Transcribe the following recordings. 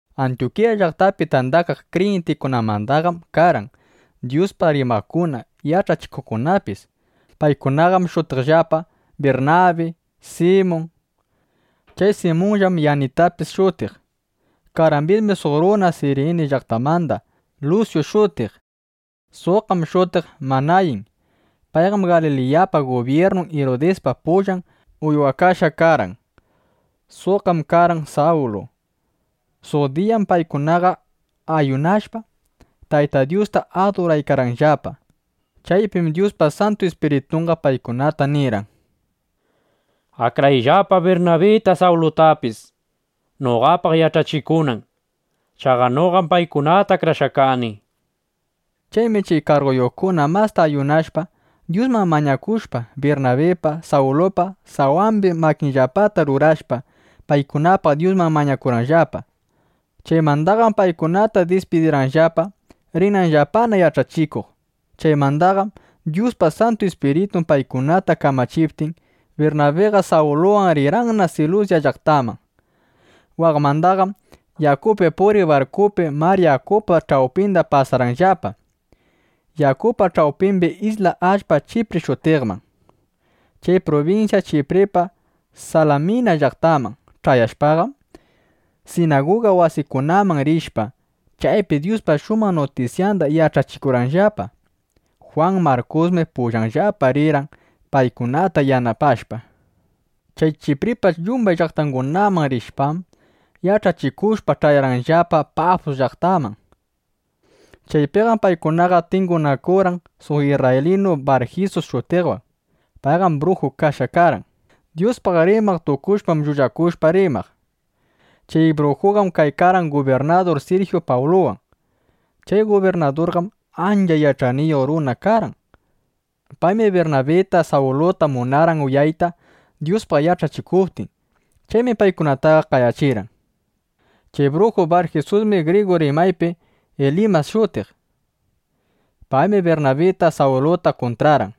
Antyukiya llaqtapi tandakaq kriyintikunamandaqam karqan Dyuspaq rimaqkuna, yach'achikuqkunapis. Paykunaqam shutiqllapa: Birnabi, Simun. Chay Simunllam Yanitapis shutiq. Karqambismi suq runa Sirini llaqtamanda Lusyu shutiq. Suqqam shutiq Manayin. Payqam Galiliyapa gubyirnun Irudispa pullan uywakashqa karqan. Suqqam karqan Sawlu (Pablu). Suq diyam paykunaqa ayunashpa, Tayta Dyusta aduraykarqanllapa. Chaypim Dyuspa Santu Ispiritunqa paykunata nirqan: —Akrayllapa Birnabita, Sawlutapis, noqapaq yach'achikunan. Chaqa noqam paykunata akrashqa kani, nishpa. Chaymi chay karguyuqkuna masta ayunashpa, Dyusman mañakushpa, Birnabipa, Sawlupa sawambi makinllapata rurashpa, paykunapaq Dyusman mañakurqanllapa. Chaymandaqam paykunata dispidirqanllapa, rinanllapana yach'achikuq. Chaymandaqam Dyuspa Santu Ispiritun paykunata kamachiptin, Birnabiqa Sawluwan rirqanna Silusya llaqtaman. Waqmandaqam yakupi puriq barkupi mar yakupa ch'awpinda pasarqanllapa yakupa ch'awpimbi isla allpa Chipri shutiqman. Chay prubinsya Chipripa Salamina llaqtanman ch'ayashpaqam, sinaguga wasikunaman rishpa, chaypi Dyuspa shumaq nutisyanda yach'achikurqanllapa. Jwan Markusmi pullanllapa rirqan paykunata yanapashpa. Chay Chipripa yumbay llaqtangunaman rishpam, yach'achikushpa, ch'ayarqanllapa Pafus llaqtaman. Chaypiqam paykunaqa tingunakurqan suq isrraylinu Barjisus shutiqwan. Payqam bruju karqan. Dyuspaq rimaq tukushpam, llullakushpa rimaq. Chay brujuqam kaykarqan gubirnadur Sirjyu Pawluwan. Chay gubirnadurqam ancha yach'ayniyuq runa karqan. Paymi Birnabita, Sawluta munarqan uyayta, Dyuspaq yach'achikuptin. Chaymi paykunataqa qayachirqan. Chay bruju Barjisusmi grigu rimaypi Ilimas shutiq. Paymi Birnabita Sawluta kuntrarqan,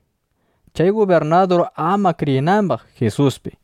chay gubirnadur ama kriyinambaq Jisuspi.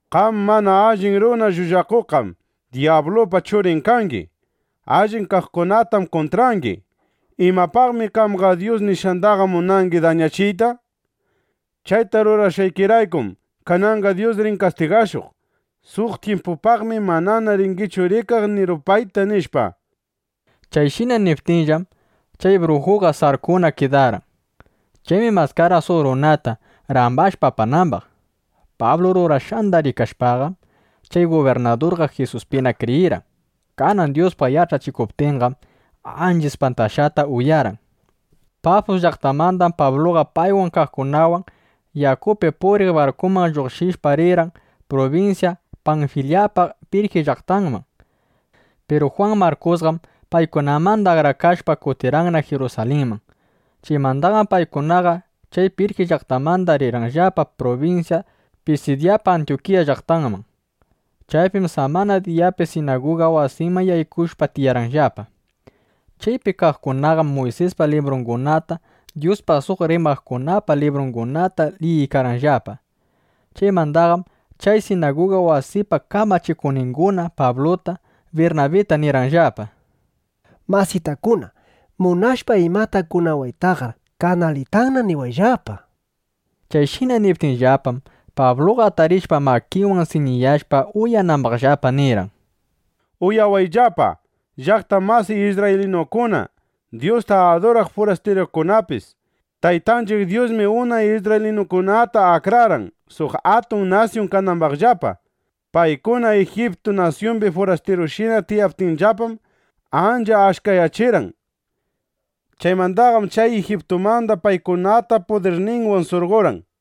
—¡Qam mana allin runa llullakuqqam dyablupa churin kangi! ¡Allin kaqkunatam kuntrangi! ¿Imapaqmi qamqa Dyus nishqandaqa munangi dañachiyta? Chayta rurashqaykiraykum, kananqa Dyus rin kastigashuq. Suq tyimpupaqmi manana ringichu rikaq ni rupayta, nishpa. Chayshina niptinllam, chay brujuqa sarkuna kidarqan. Chaymi maskarqan suq runata, rambashpa apanambaq. Pablu rurashqanda rikashpaqam, chay gubirnadurqa Jisuspina kriyirqan. Kanan Dyuspaq yach'achikuptinqam, ancha ispantashqata uyarqan. Pafus llaqtamandam Pabluqa paywan kaqkunawan yakupi puriq barkuman lluqshishpa, rirqan prubinsya Panfilyapa Pirji llaqtanman. Piru Jwan Markusqam paykunamanda akrakashpa, kutirqanna Jirusalinman. Chaymandaqam paykunaqa chay Pirji llaqtamanda rirqanllapa prubinsya Pisidyapa Antyukiya llaqtanman. Chaypim samana diyapi sinaguga wasiman yaykushpa tiyarqanllapa. Chaypi kaqkunaqam Muysispa librungunata Dyuspaq suq rimaqkunapa librungunata liyiykarqanllapa. Chaymandaqam chay sinaguga wasipa kamachikuqninguna Pabluta, Birnabita nirqanllapa: —Masitakuna, munashpa imata kunawaytaqar kanalitanna niwayllapa, nishpa. Chayshina niptinllapam, Pabluqa atarishpa makinwan siñiyashpa uyanambaqllapa, nirqan: —Uyawayllapa, llaqta masiy isrraylinukuna, Dyusta aduraq furastirukunapis. Taytanchiq Dyusmi unay isrraylinukunata akrarqan, suq atun nasyun kanambaqllapa. Paykuna Ijiptu nasyumbi furastirushina tiyaptinllapam, ancha achkayachirqan. Chaymandaqam chay Ijiptumanda paykunata pudirninwan surqorqan.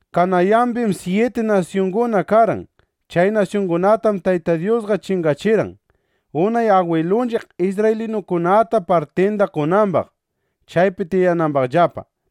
Kanayambim syiti nasyunguna karqan. Chay nasyungunatam Tayta Dyusqa chingachirqan, unay agwilunchiq isrraylinukunata partinda qonambaq, chaypi tiyanambaqllapa.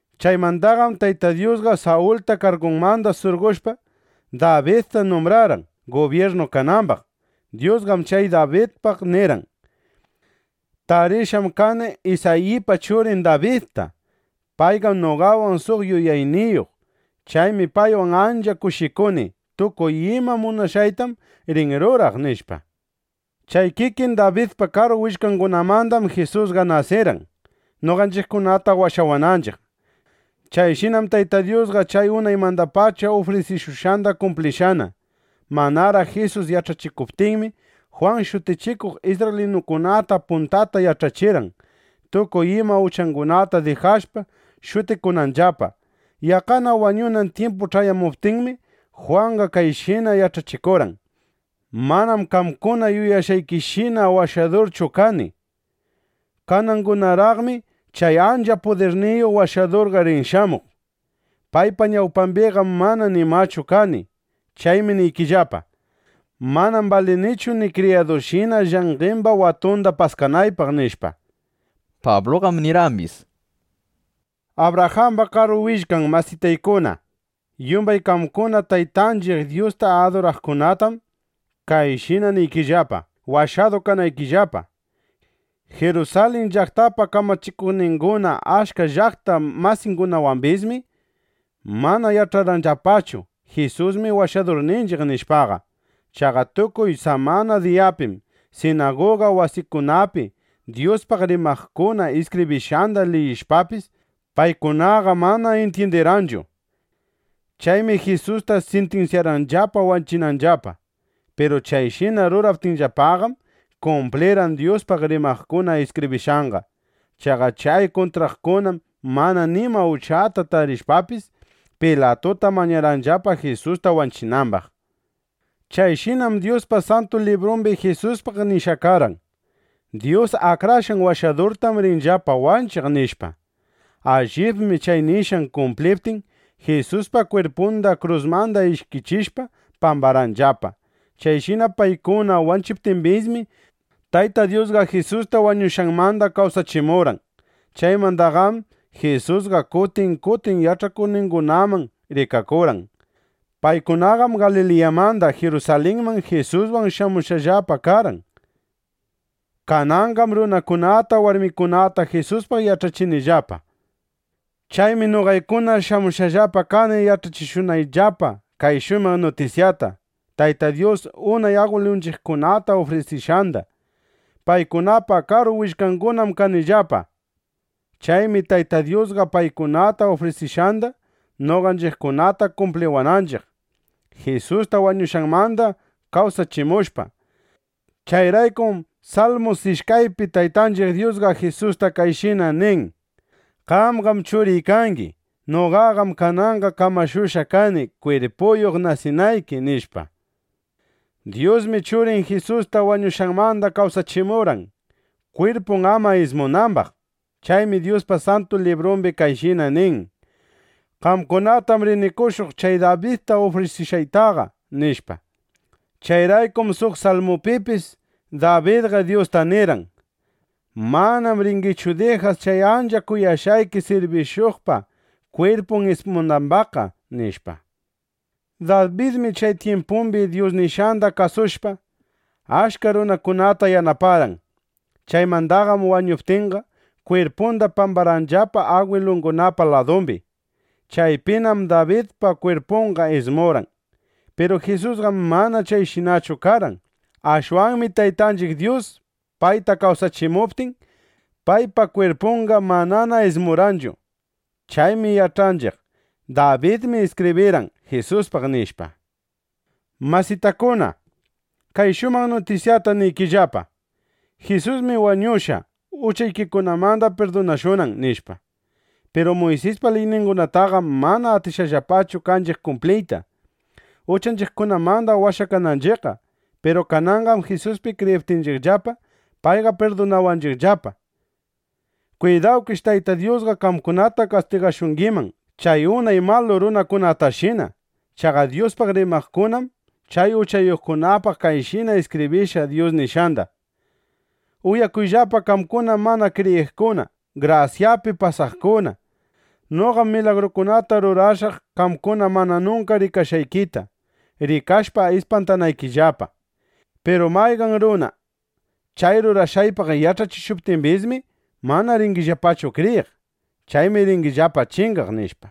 ’Chaymandaqam Tayta Dyusqa Sawulta kargunmanda surqoshpa, Dabidta numbrarqan, gubyirnu kanambaq. Dyusqam chay Dabidpaq nirqan: “Tarishqam kani Isayipa churin Dabidta. Payqam noqawan suq yuyayniyuq. Chaymi paywan ancha kushikuni. Tukuy ima munashqaytam rin ruraq”, nishpa. Chay kikin Dabidpa karu willkangunamandam Jisusqa nasirqan, noqanchiqkunata washawananchiq. Chayshinam Tayta Dyusqa chay unaymandapacha ufrisikushqanda kumplishqana. Manaraq Jisus yach'achikuptinmi, Jwan Shutichikuq isrraylinukunata puntata yach'achirqan, tukuy ima uchangunata dijashpa, shutikunanllapa. Yaqqana wañunan tyimpu ch'ayamuptinmi, Jwanqa kayshina yach'achikurqan: “Manam qamkuna yuyashqaykishina Washadurchu kani. Kanangunaraqmi chay ancha pudirniyuq Washadurqa rin shamuq. Paypa ñawpambiqam mana nimachu kani. Chaymi niykillapa: Manam balinichu ni kriyadunshina llanqemba watunda paskanaypaq” nishpa. Pabluqam nirqambis: —Abrajamba karu willkan masitaykuna, yumbay qamkuna Taytanchiq Dyusta aduraqkunatam kayshina niykillapa, washadu kanaykillapa: Jirusalin llaqtapa kamachikuqninguna achka llaqta masingunawambismi mana yach'arqanllapachu: Jisusmi Washadurninchiq, nishpaqa. Chaqa tukuy samana diyapim sinaguga wasikunapi Dyuspaq rimaqkuna iskibrishqanda liyishpapis, paykunaqa mana intyindirqanchu. Chaymi Jisusta sintinsyarqanllapa wanchinanllapa. Piru chayshina ruraptinllapaqam, kumplirqan Dyuspaq rimaqkuna iskibrishqanqa. Chaqa chay kuntraqkunam mana nima uchata tarishpapis, Pilatuta mañarqanllapa, Jisusta wanchinambaq. Chayshinam Dyuspa Santu Librumbi Jisuspaq nishqa karqan: “Dyus Akrashqan Washadurtam rinllapa wanchiq”, nishpa. Allibmi chay nishqan kumpliptin, Jisuspa kwirpunda krusmanda ishkichishpa pambarqanllapa. Chayshina paykuna wanchiptimbismi, Tayta Dyusqa Jisusta wañushqanmanda kawsachimurqan. Chaymandaqam Jisusqa kutin kutin yach'akuqningunaman rikakurqan. Paykunaqam Galiliyamanda Jirusalinman Jisuswan shamushqallapa karqan. Kananqam runakunata, warmikunata Jisuspaq yach'achinllapa. ’Chaymi noqaykuna shamushqallapa kani yach'achishuqllapa kay shumaq nutisyata, Tayta Dyus unay agwilunchiqkunata ufrisishqanda. Paykunapa karu willkangunam kanchiqllapa. Chaymi Tayta Dyusqa paykunata ufrisishqanda noqanchiqkunata kumpliwanchiq, Jisusta wañushqanmanda kawsachimushpa. Chayraykum Salmu ishkaypi Taytanchiq Dyusqa Jisusta kayshina nin: “Qamqam Churiy kangi. Noqaqam kananqa kamashushqa kani, kwirpuyuq nasinayki”, nishpa. Dyusmi Churin Jisusta wañushqanmanda kawsachimurqan, kwirpun ama ismunambaq. Chaymi Dyuspa Santu Librumbi kayshina nin: “Qamkunatam rini qoshuq chay Dabidta ufrisishqaytaqa”, nishpa. Chayraykum suq salmupipis Dabidqa Dyusta nirqan: “Manam ringichu dijaq chay ancha kuyashqayki sirbishuqpa kwirpun ismunambaqqa”, nishpa. Dabidmi chay tyimpumbi Dyus nishqanda kasushpa, achka runakunata yanaparqan. Chaymandaqam wañuptinqa, kwirpunda pambarqanllapa agwilungunapa ladumbi. Chaypinam Dabidpa kwirpunqa ismurqan. Piru Jisusqam mana chayshinachu karqan. Ashwanmi Taytanchiq Dyus payta kawsachimuptin, paypa kwirpunqa mana ismurqanchu. (Chaymi yach'anchiq: Dabidmi iskibrirqan Jisuspaq, nishpa.) Masitakuna, kay shumaq nutisyata niykillapa: Jisusmi wañushqa, uchaykikunamanda pirdunashunan, nishpa. Piru Muysispa liyningunataqam mana atishqallapachu kanchiq kumpliyta, uchanchiqkunamanda washakananchiqqa. Piru kananqam Jisuspi kriyiptinchiqllapa, payqa pirdunawanchiqllapa. Kwidawkish Tayta Dyusqa qamkunata kastigashungiman chay unay malu runakunatashina. Chaqa Dyuspaq rimaqkunam chay uchayuqkunapaq kayshina iskibrishqa Dyus nishqanda: Uyakuyllapa qamkuna mana kriyiqkuna, grasyapi pasaqkuna. Noqam milagrukunata rurashaq qamkuna mana nunka rikashqaykita, rikashpa ispantanaykillapa. Piru mayqan runa chay rurashqaypaq yach'achishuptimbismi, mana ringillapachu kriyiq. Chaymi ringillapa chingaq, nishpa.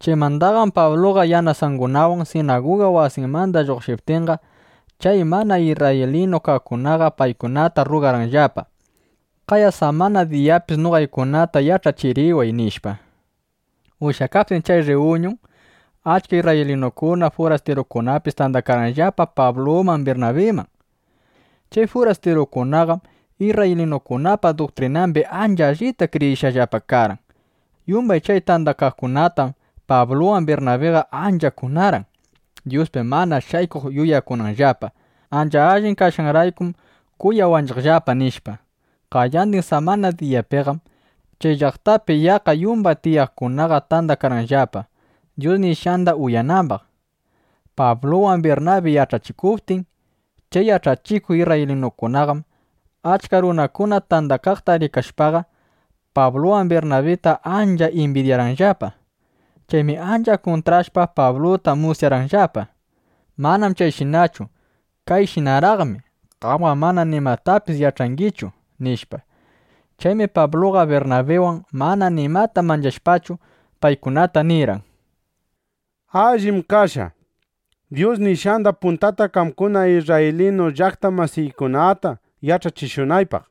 Chaymandaqam Pabluqa yanasungunawan (yanasangunawan) sinaguga wasimanda lluqshiptinqa, chay mana isrraylinu kaqkunaqa paykunata rrugarqanllapa: —Qaya samana diyapis noqaykunata yach'achiriway, nishpa. Ushyakaptin chay rriyuñun, achka isrraylinukuna, furastirukunapis tandakarqanllapa Pabluman Birnabiman. Chay furastirukunaqam isrraylinukunapa duktrinambi ancha allita kriyishqallapa karqan. Yumbay chay tandakaqkunatam Pabluwan Birnabiqa ancha kunarqan, Dyuspi mana shaykuq yuyakunanllapa: “Ancha allin kashqanraykum kuyawanchiqllapa” nishpa. Qayandin samana diyapiqam chay llaqtapi yaqqa yumbay tiyaqkunaqa tandakarqanllapa, Dyus nishqanda uyanambaq, Pabluwan Birnabi yach'achikuptin. Chay yach'achikuq isrraylinukunaqam, achka runakuna tandakaqta rikashpaqa, Pabluwan Birnabita ancha imbidyarqanllapa. Chaymi ancha kuntrashpa, Pabluta musyarqanllapa: —Manam chayshinachu. Kayshinaraqmi. Qamqam mana nimatapis yach'angichu, nishpa. Chaymi Pabluqa Birnabiwan mana nimata manchashpachu, paykunata nirqan: —Allim kashqa, Dyus nishqanda puntata qamkuna isrraylinu llaqta masiykunata yach'achishunaypaq.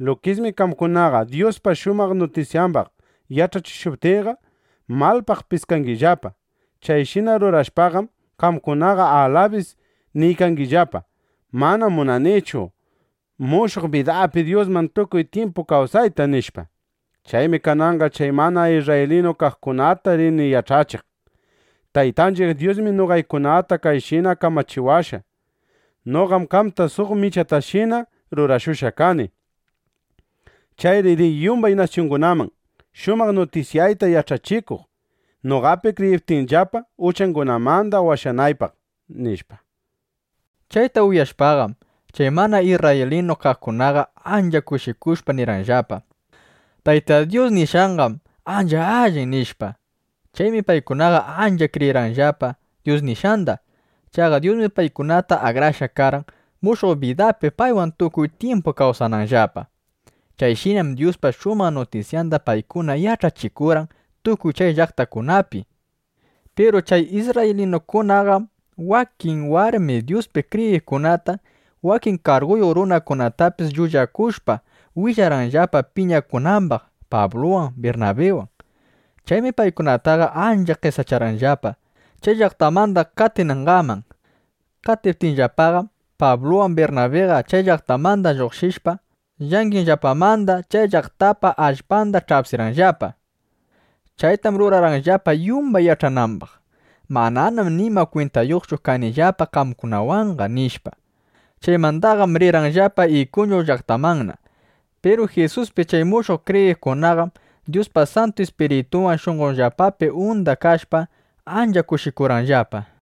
Lukismi qamkunaqa Dyuspa shumaq nutisyambaq yach'achishuptiyqa, malpaq piskangillapa. Chayshina rurashpaqam, qamkunaqa alabis niykangillapa: “Manam munanichu mushuq bidapi Dyuswan tukuy tyimpu kawsayta” nishpa. Chaymi kananqa chay mana isrraylinu kaqkunata rini yach'achiq. Taytanchiq Dyusmi noqaykunata kayshina kamachiwashqa: Noqam qamta suq michatashina rurashushqa kani. Chayri riy yumbay nasyungunaman, shumaq nutisyayta yach'achikuq, noqapi kriyiptinllapa, uchangunamanda washanaypaq, nishpa. Chayta uyashpaqam, chay mana isrraylinu kaqkunaqa ancha kushikushpa nirqanllapa: —Tayta Dyus nishqanqam ancha allin, nishpa. Chaymi paykunaqa ancha kriyirqanllapa Dyus nishqanda. Chaqa Dyusmi paykunata akrashqa karqan, mushuq bidapi paywan tukuy tyimpu kawsananllapa. Chayshinam Dyuspa shumaq nutisyanda paykuna yach'achikurqan tukuy chay llaqtakunapi. Piru chay isrraylinukunaqam wakin warmi Dyuspi kriyiqkunata, wakin karguyuq runakunatapis llullakushpa willarqanllapa, piñakunambaq Pabluwan Birnabiwan. Chaymi paykunataqa ancha qesacharqanllapa, chay llaqtamanda qatinangaman. Qatiptinllapaqam, Pabluwan Birnabiqa chay llaqtamanda lluqshishpa, llanqenllapamanda chay llaqtapa allpanda ch'apsirqanllapa. (Chaytam rurarqanllapa, yumbay yach'anambaq: Mananam nima kwintayuqchu kanillapa qamkunawanqa, nishpa.) Chaymandaqam rirqanllapa Ikuñu llaqtamanna. Piru Jisuspi chay mushuq kriyiqkunaqam Dyuspa Santu Ispiritunwan shunqonllapapi unda kashpa, ancha kushikurqanllapa.